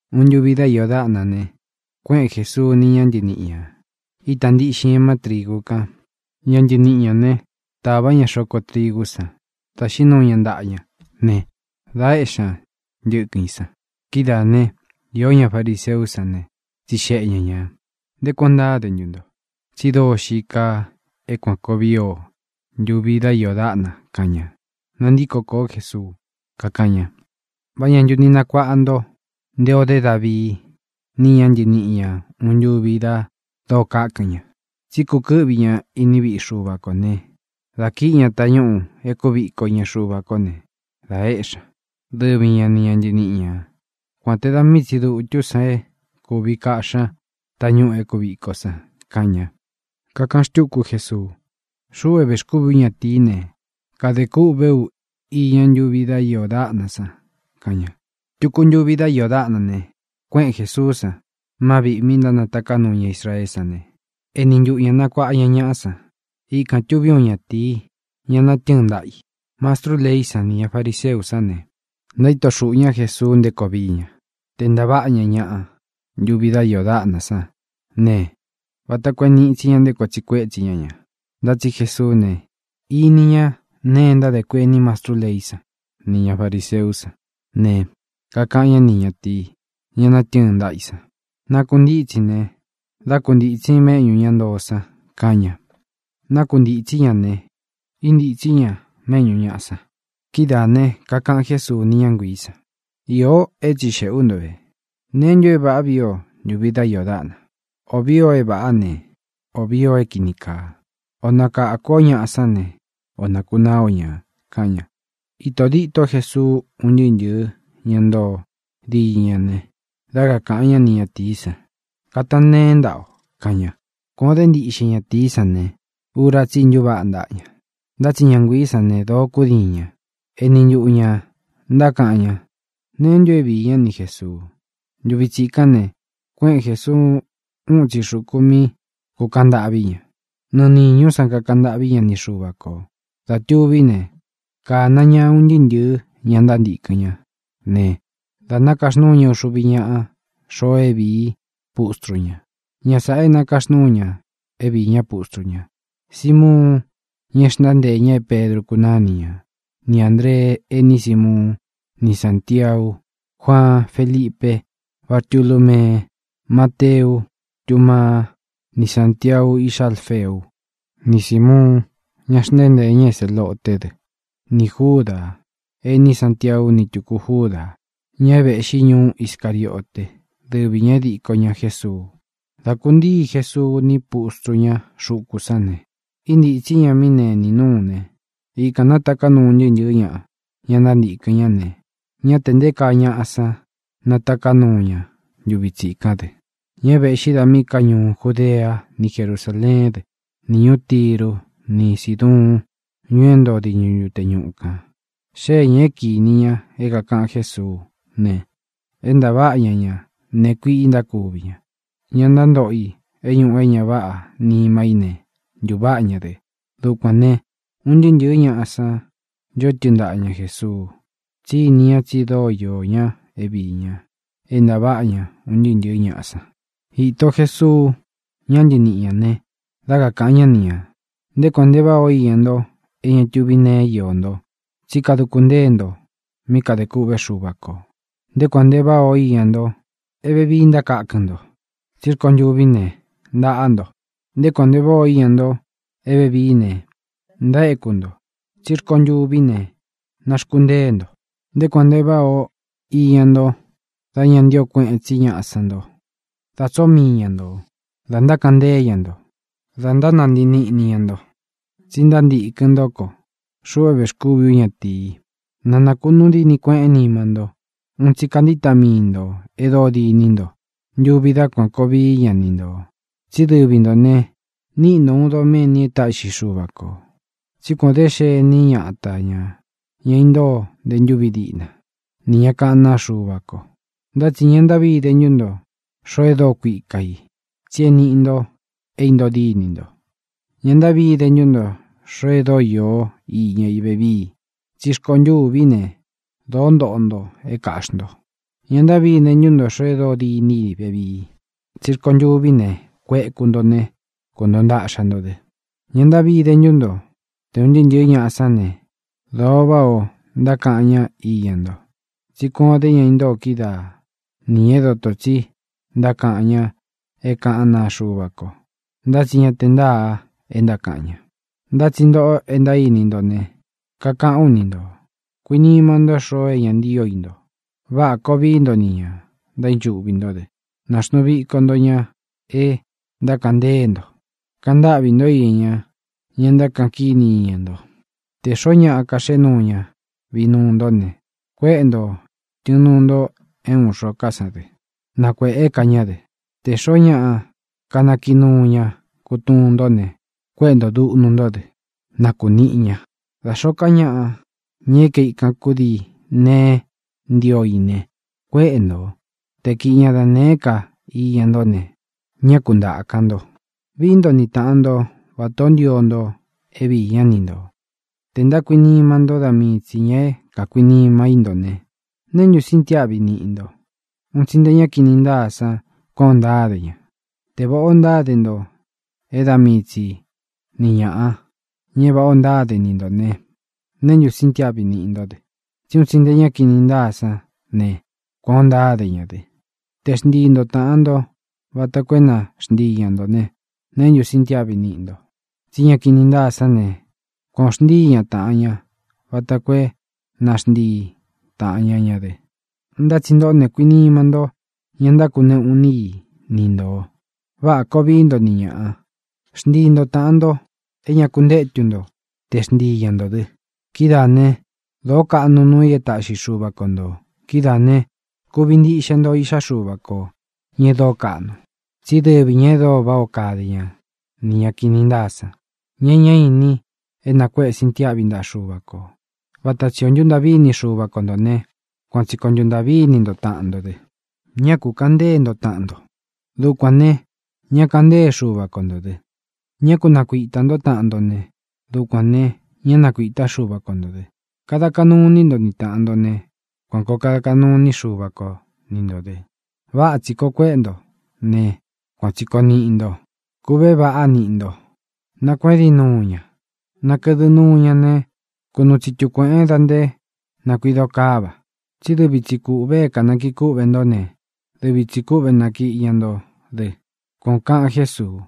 Uun ntuvi dá iō dáꞌna ne, kuéꞌen Jesuu ni ña ntɨníꞌi ñā, ítā ntiꞌxin ña má trīgu kan. Ña ntɨniꞌi ñā né, tāvá ña xoko trigú san, dā xiín nuu ña ntaꞌa ña ne, dā éꞌxi ña ntɨkɨn i san. Kidáā né, iō ñá fariseú san ne, tsixeꞌe ña ñā: —¿Nté kuān ó ntáde ntu nto? Tsi dóo xií kaa é kuān koo vii o ntuvi dá iō dáꞌna —kaꞌan ña. Nantíko kōó Jesuu, kakáꞌan ña: —¿Vá ña ntu ni nakuaꞌa nto nté ō dé Davii ni ña ntɨníꞌi ña uun ntuvi da dóo kákɨn ña? Tsí kukɨ́ꞌvi ña iní viꞌi Xuva kō né, dā kíꞌi ña tañúꞌū e kúviko iña Xuva kó ne, dā éꞌxi ña, dɨvi ña nī ña ntɨníꞌi ña, kuān te da mii tsi dutú san é kūvi kaꞌxí ña tañúꞌū e kúviko san —kaꞌan ña. Kakaꞌan xtúku Jesuu: —Xuꞌu é vēxkúvi ú ñatīí ne, kadē kûꞌvé u iña ntúvi dá iō dáꞌna san —kaꞌan ña. Tuku ntuvi dá iō dáꞌna ne, kuéꞌen Jēsuú san má viꞌī mi ntánataká nuu ña Israeé san ne, eni ntuꞌu ña kanakuāꞌa ña ñaꞌa san. Ikān tuví uun ñatīí, ña natɨ́ɨn ntaꞌa i. Mastrú leí san nī ña fariseú san ne, ntaíto xuꞌū ñá Jesuu nté koo vií ña, tē ntaváꞌa ña ñaꞌa ntúvi dá iō dáꞌna san ne, vata koo é nīꞌi tsi ña nté koo tsiꞌi kuétsi ña ñā. Ntá tsi Jesuú ne, iní ña nee e ntádē kuení mastrú leí san nī ña fariseú san ne, kakaꞌan ñá ni ñatīi, ña natɨ́ɨn ntaꞌa i san: —Nākuntítsin ne, dá kuntītsin méꞌñū ña ntoo san —kaꞌan ña. Nákuntītsí ña ne, íntītsí ña méꞌñū ñaꞌa san. Kidáā ne, kakaꞌan Jésuu ni ña nguií san: —Iō é tsixēꞌe ú nto ve. ¿Neé ntu é vāꞌá vii o ntuvi dá iō dáꞌna? ¿Ō vii o é vāꞌá ne, ō vii o é kīni kaa? ¿O nakākú o ñāꞌa sán ne, o nākunaá o ña? —kaꞌan ña. Īto díto Jesuu un ntɨɨ́ ntɨ̄ɨ́ ña ntoo diñɨ ña ne, dá kakāꞌan ñá ni ñatīí san: —Katan nteén ntaꞌa o —kaꞌan ña. Kuān o dé ntiꞌxe ñatīí san ne, ura tsí i ntuváꞌa ntaꞌa ña. Ntá tsi ña nguiī sán ne, dōo kúdiin ña. Eni ntuꞌu ñā ntákaꞌan ña neé ntu é viī ñá ni Jēsuu. Ntuvi tsikán ne, kuéꞌen Jēsuú uun itsi xukū mí kūkaꞌan ntâꞌví ña. Nɨɨ nīñú san kakaꞌan ntâꞌví ña ni Xuva kō. Dā tuví ne, kāna ñá un ntɨɨ́ ntɨ̄ɨ́ ña ntántīkɨn ñá ne, da nākaxnúu ña uxuvi ñáꞌa xoo é vīí i pustru ña. Ña sāꞌa é nakaxnúu ña é viī ñá pustru ña: Simuun, ña e xntánteē ña é Pedru kunáni ña; ni Āndree, ení Simuun; ni Sāntiau, Juaan, Felipe, Bartulumee, Mateu, Tumaa, ni Sántiau, iꞌxá Alfeu; ni Sīmuun, ña xntánteē ña é Zeloté dɨ; nī Júdā, ení Santiau; ni tūku Júdā, ñá é vēꞌxí ñuú Iscariote, dɨvi ñā é diko ña Jēsuu. Dá kūntíi Jesuu ni pústru ña xuku sán ne, íntītsí ña mí nenī núu ne, ikān nátaká nuu un ntɨɨ́ ntɨ̄ɨ́ ñaꞌa, ña ntántīkɨn ñá ne, ñá tē nté kaa ñaꞌa san nátaká nuu ña ntuvi tsikán dɨ, ña é vēꞌxí da míꞌī ká ñuú Judea ni Jerusáleén dɨ, ni ñūú Tiru ni Síduun, ñuu é ntoo diñɨ ntute ñuꞌu kān. Xée ñā é kinī ña é kākaꞌan Jésuú ne, é ntaváꞌa ña ña nēe kuiꞌi ntákuvi ña. Ña ntántoꞌo i é ñuꞌu é ña váꞌā nima í ne, ntuváꞌa ña dɨ. Dukuān ne, un ntɨɨ́ ntɨ̄ɨ́ ñaꞌa san ncho tɨ́ɨn ntaꞌa ña Jēsuu, tsí ini ña tsi dóo iō ñá é viī ña é ntaváꞌa ña un ntɨɨ́ ntɨ̄ɨ́ ñaꞌa san. Īto Jesuu ña ntɨníꞌi ña ne, dá kakāꞌan ñá ni ñā: —Nté kuān nte váꞌā o iña nto é ña tuví neé iō nto, tsí kaduku ntée nto mí kadē kûꞌvé Xuva kō. ʼNté kuān nte váꞌā o iña nto é vevií e ntákakɨn nto, tsí rkontûví ne, ntaꞌa nto. ʼNté kuān nte váꞌā o iña nto é vevií ne, ntaéku nto, tsí rkontûví ne, naxkuntée nto. ʼNté kuān nte váꞌā o iña nto dá ña ntío kueꞌen tsí ñaꞌa sán nto, da tsoó mii ña ntō, da ntákaꞌan ntée ña nto, da ntánantii níꞌni ña nto tsi ntántīkɨn ntó ko, xuꞌu é vēxkúvi ú ñatīi. Na nākunuu díni kueꞌén nima nto. Un tsi kantíta mii ntō e dóo dîní nto ntuvi dá kuan kōo vií ña ni ntō. Tsí dɨvi ntō ne, níꞌi nto ūun doméni é taꞌxi Xuva kō. Tsí kuān o dé xení ñata ñā, ña intóo nte ntúvi diꞌna, nī ña kaꞌán naa Xuva ko. ʼNtá tsi ña ntáꞌvi ide ntú nto, xoo é dóo kuika i, tsi é nīꞌi nto é intoo dínī nto. ʼÑa ntáꞌvi ide ntú nto, xoo é dóo īó iña i vevii, tsí rkontûví ne, dōo ntoꞌo nto é kāꞌxi nto. ʼÑa ntáꞌvi ide ntú nto, xoo é dóo dîní i vevii, tsí rkontûví ne, kueku nto ne, kuntoo ntaꞌxa nto dɨ. ʼÑa ntáꞌvi ide ntú nto tē un ntɨɨ́ ntɨ̄ɨ́ ñaꞌa sán ne, dōo váꞌā ó ntákaꞌan ñá iña nto, tsí kuān o dé ña intóo kídaa nī ña é dotō tsi ntákaꞌan ña é kaꞌan ñá naa Xuva ko, ntá tsi ña te ntáā e ntákaꞌan ña. ʼNtá tsi ntōꞌo e ntaíni nto ne, kakaꞌán u ni ntō: Kuinima ntó xoo é ña ntío i nto. Váꞌa kō vií nto nī ña ntaínchuꞌvi ntó dɨ. Nāxnuu viko nto ña e ntákaꞌan ntée nto. Kantáꞌvī ntó iña ña ntákaꞌan kíni iña nto. Tē xoó ñaꞌa kaxéꞌe nuu ña vinuu ntó ne, kuéꞌe ntō tɨnuu nto é ūun xo ká san dɨ, na kuēꞌé ka ñá dɨ. Tē xoó ñaꞌa kanakiꞌi nuu ña kutuun ntó ne, kuéꞌe nto dūꞌnu ntó dɨ, na kunīꞌi ña. Da xōó ka ñaꞌa, ña é kaikan kudii neé ntio i ne, kuéꞌe ntō. Te kiꞌi ña da nēé ka iña ntó ne, ñá ku ntāka nto. Vií nto ni tāꞌan nto vatā ó ntio nto é viī ñá ni ntō. ʼTē ntákuinima ntó da mii tsī ña é kākuinima í nto ne, ¿neé ntu sintiáꞌvi niꞌi nto? Un tsi nté ña kini ntáa san kuān ó ntáde ña. Te vāꞌá o ntáde nto é da mii tsi ni ñāꞌa, ña é vāꞌá o ntáde ni ntō ne, ¿neé ntu sintiáꞌvi niꞌi ntó dɨ? Tsí un tsi nte ñá kini ntáa sán ne, kuān ó ntáde ña dɨ. Te xntii nto tāꞌan nto vata koo é na xntii ña ntō ne, ¿neé ntu sintiáꞌvi niꞌi nto? Tsí ña kini ntáa sán ne, kuān o xntíi ña tāꞌan ña vata koo é na xntii tāꞌan ña ña dɨ. Ntá tsi ntoꞌó ne, kuinima ntó ña ntákuneꞌu iní i ni ntō. Váꞌa kōo vií nto ni ñāꞌa. Xntii nto tāꞌan nto é ña kuntétu nto te xntii ña ntō dɨ. Kidáā né, dōó kaꞌnu nuu i é taꞌxi Xuva ko ntō. Kidáā ne, kuvi ntiꞌxe nto iꞌxá Xuva kō, ña e dóo kaꞌnu. Tsí dɨvi ñā e dóo váꞌā ó kade ña nī ña kini ntáa san, ña e ñá ini é nakuéꞌe sintiáꞌvi ntaꞌa Xuva kō. Vata tsī o ntúntaꞌví ini Xuva ko ntō ne, kuan tsi kōo ntuntaꞌví ini nto taꞌan nto dɨ. ʼÑá kū kaꞌan ntée nto taꞌan nto. Dukuān ne, ñá kaꞌan ntée Xuva ko ntō dɨ. Ñá ku nakuitā ntó taꞌan nto ne, dukuān ne, ñá nakuītá Xuva ko ntō dɨ. Kada kaꞌnu iní nto ni tāꞌan nto ne, kuan kōo kada kaꞌnu iní Xuva ko ni ntō dɨ. Vata tsī koo kuéꞌe nto ne, kuan tsī koo niꞌi nto. Kūꞌvé vaꞌá niꞌi nto. Nakuédin nuu ña, nakɨdɨ nuu ña ne, kunuu tsitu kuēꞌen da nté nakuīdo káva. Tsí dɨvi tsī kúꞌvē é kānakii kúꞌvē ntó ne, dɨvi tsī kúꞌve nātaꞌxi ña nto dɨ —kuan ō kaꞌan Jésuu.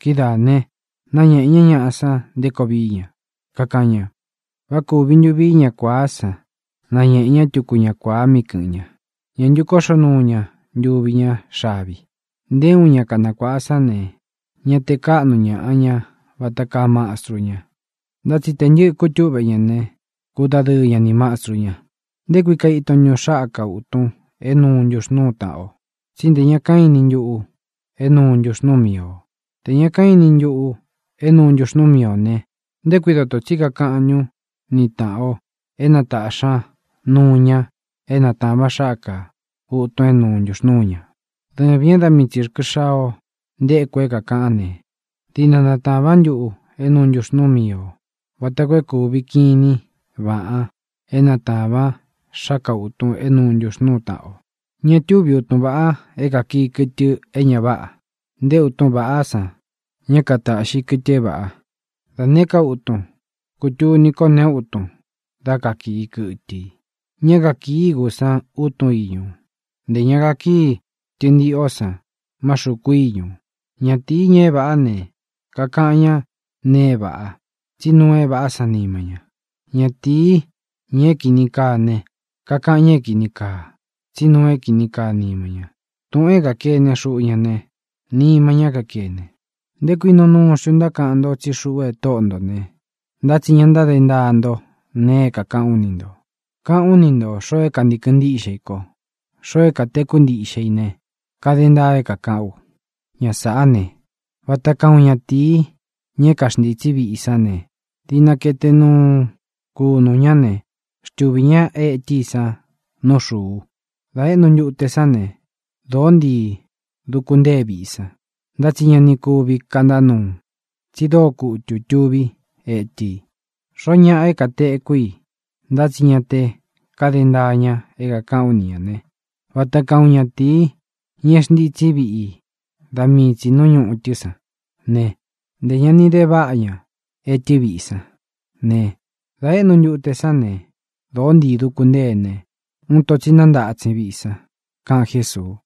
Kidáā ne, nañéꞌē ñá ñaꞌa san nté koo vií ña, kakaꞌan ña: —¿Vá kūvi ntu vií uun ña kuāá san nañēꞌe ñá tuku ña kuāa míꞌi kɨ̄ꞌɨn ña? ¿Ñā ntu kóꞌxo nuu ña ntuvi ñá xavi? Nté uun ña kanakuāꞌa sán ne, ñá tē káꞌnu ñaꞌa ña vata kaa mastru ña. Ntá tsi tē ntɨ́ꞌɨ̄ kútuꞌve ña ne, kudadɨɨ ña ni mastru ña. ʼ¿Nté kui kaiton ntun xáka ūtun é nūu ntuxnúu tāꞌan o? Tsí nte ña kaínin ntuꞌu é nūu ntuxnúu mii ō. Tē ña kaínin ntuꞌu é nūu ntuxnúu mii ō ne, ¿nté kui dōto tsí kakaꞌan ntún ni tāꞌan o é na tāꞌxi ña nuu ña é natāvan xáka ūtun é nūu ntuxnúu ña? Dɨvīn e dá mii tsi rkɨ xaa o ntéku é kākaꞌán ne, diꞌna natāvan ntuꞌu é nūu ntuxnúu mii ō vata koo é kūvi kinín vāꞌan é natāvan xáka ūtun é nūu ntuxnúu tāꞌan o. ʼÑa túvi utun vāꞌa é kātaꞌxi kɨtɨ é ña váꞌā. Nté utun ña váꞌā san ña katáꞌxi kɨtɨ é vāꞌa. Da nēé ka utun, kutuni ko neé utun dá kakii kɨtɨ i. Ñá kakīi igú san utun iñu, ntē ña kakíi tɨntiꞌó san má xuku íñū. Ñatīi, ña é vāꞌá ne, kakaꞌan ña nee é vāꞌa, tsí nuu é vāꞌá san nima ña. Ñatīi, ña é kīni kaa ne, kakaꞌan ña é kīni kaa, tsí nuu é kīni kaa nima ña. Tūꞌun é kākene xuꞌu ña ne, nima ñá kakene. ʼ¿Nté kui nuu nuu xntu ntákaꞌan nto tsí xuꞌu é Tóꞌo ntō ne, ntá tsi ña ntáde ntaa nto nee é kākaꞌán u ni ntō? Kaꞌán u ni ntō xoo é kantīkɨn ntíꞌxe i ko, xoo é katekú ntiꞌxe i ne, kade ntaa é kākaꞌán u. Ña sāꞌá ne, vata kaa uun ñatīi, ña é kaxntitsi viꞌi sán ne, diꞌna kaete nuu kunū ñá ne, xtuvī ñá etɨ i san nú xūu. Dā éꞌnu ntute sán ne, dōó ntii duku ntée viꞌi san. Ntá tsi ña ni kuvi kantá nuu, tsi dóo kutū tuví etɨ́ i. Xoó ñaꞌa é katekú i ntá tsi ña te kade ntaa ña é kākaꞌán u ni ñā ne, vata kaa uun natīi, na é xntītsí viꞌi i da mii tsī nú ñūꞌu sán ne; ntē ña ni de váꞌa na etɨ́ viꞌi sán ne, dā éꞌnu ntute sán ne, dōó ntii duku ntée ne, uun ito tsi nántatsin á viꞌi san —kaꞌan Jésuu.